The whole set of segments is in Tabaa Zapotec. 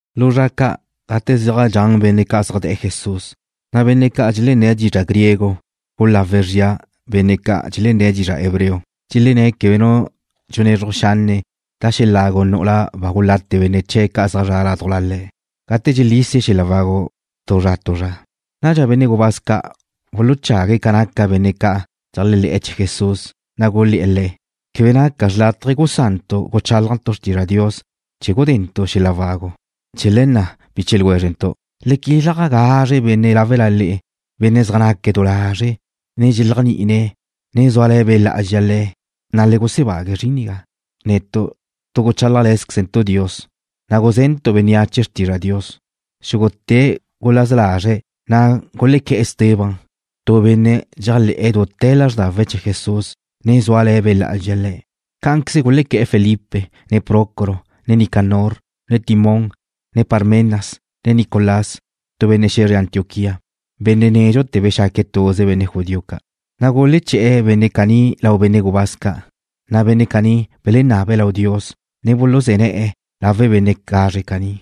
Lu zra ca', gate zaj dxan benne' ca' zaj de̱'e̱ Jesús, na' benne' ca' dxelenné̱' dizra' griego gulawe̱' zria benne' ca' dxelenné̱' dizra' hebreo. Dxelenné̱' quebe nu dxunezruj xanne' da xeláw nu'ula ba gulate benne' chee̱' zaj zre̱'e̱ ládujla le̱' gate dxelísie̱' xel-la' wagu tu zra tu zra. Nadxa benne' gubáz ca' buluchague̱' ca naca benne' ca' dxeléajle̱'e̱ chee̱ Jesús, na' gulé̱'e̱ le̱': ―Quebe naca xrlátaje gusantu' guchálajntu' xrtizra' Dios chee̱ gudentu' xel-la' wagu. Chee̱ le̱ na', biche ljwézrentu', le quilaj gazre benne' láwela le'e, benne' zaj naque̱' du lazre', ne dxeléajni'ine̱', ne zúale̱ Be' Lá'azxa le̱', na' le gusebague̱' zrin nigá. Netu' tu guchálajle̱zquezentu' Dios, ne gusé̱dentu' bénneache xrtizra' Dios. Xúgute̱' gulaza lazre̱', na' gulequé̱'e̱ Esteban, tu benne' dxéajle̱'e̱ dute̱ lázrdawe̱' chee̱ Jesús, ne zúale̱ Be' Lá'azxa le̱'. Cá'anqueze gulequé̱'e̱ Felipe, ne Prócoro, ne Nicanor, ne Timón, ne Parmenas, ne Nicolás, tu benne' xe̱zre Antioquía, benne' nédxute̱ bexaque̱' tuze benne' judío ca'. Na' guleché̱'e̱ benne' caní lau benne' gubáz ca', na' le̱' bululáwizre̱' Dios, ne buluzé̱ ne̱'e̱ lawe' benne' gazre caní.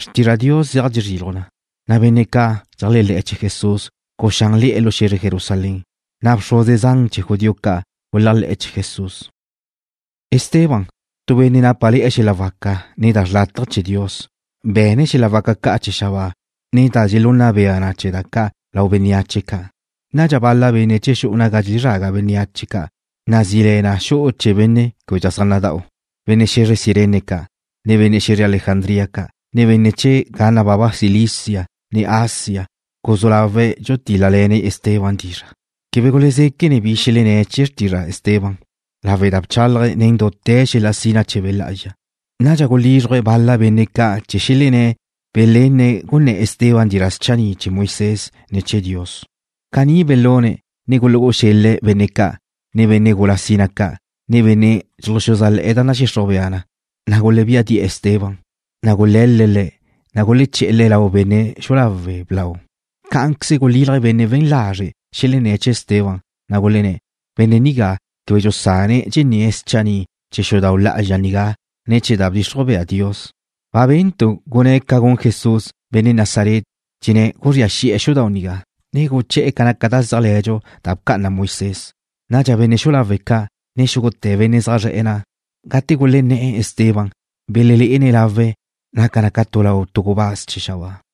Xrtizra' Dios zeaj dxezriluj na, na' benne' ca' dxeléajle̱ chee̱ Jesús guxánle̱'e̱ lu xe̱zre Jerusalén, na' bxruze zan chee̱ judío ca' guléajle̱'e̱ chee̱'. Esteban, tu benne' nápale̱'e̱ xel-la' waca, ne naque̱' chawe' lau Dios, be̱ne̱' xel-la' waca ca' chee̱ xabáa, ne da dxelunna bea na chee̱ da ca' lau bénneache ca'. Nadxa bal-la benne' chee̱ xu'u naga dxelezraga bénneache ca', nazí le na Xu'u Chee̱ Benne' Québedxa Zaj Nada'u, benne' xe̱zre Cirene ca', ne benne' xe̱zre Alejandría ca', ne benne' chee̱ ga nababa Cilicia, ne Asia, gulezú lawe̱' dxulutíl-lale̱ne̱' Esteban dizra'. Quebe gulezéquene̱' bi xelenné̱' chee̱ xrtizra' Esteban lawe' da bchálaje̱' nen dute̱ xel-la' sina chee̱ Be' Lá'azxa. Nadxa gulízruje̱' bal-la benne' ca' chee̱ xelenné̱' belenne̱' gunné̱ Esteban dizra' schanni' chee̱ Moisés, ne chee̱ Dios. Caní belune̱', ne gulu'e̱ xel-le̱' bénneache ca', ne benne' gula sina ca', ne benne' dxuluxuzájle̱'e̱ da nadxixruj bea na, na' gulebía di'e̱ Esteban. Gule̱l-le̱' le̱', ne guleché̱'e̱ le̱' lau benne' xu'u lawe' blau. Cá'anqueze gulílaje̱' benne' we̱n lazre' xelenné̱' chee̱ Esteban, na' gulenné̱': ―Benne' nigá quebe dxusane̱' dxenné̱' schanni' chee̱ xudau' lá'azxa nigá, ne chee̱ da bdxixruj bea Dios. Ba bentu' gunné̱' ca gun Jesús, benne' Nazaret, dxenné̱' guzría xi'e̱ xudau' nigá, ne guché̱'e̱ ca naca da zéajle̱dxu da bca'ana Moisés. Nadxa benne' xu'u lawe' ca', ne xúgute̱ benne' zaj zre̱'e̱ na', gate gulenné̱'e̱ Esteban, belelé'ene̱' lawe̱', naca na ca lau tu gubáz chee̱ xabáa.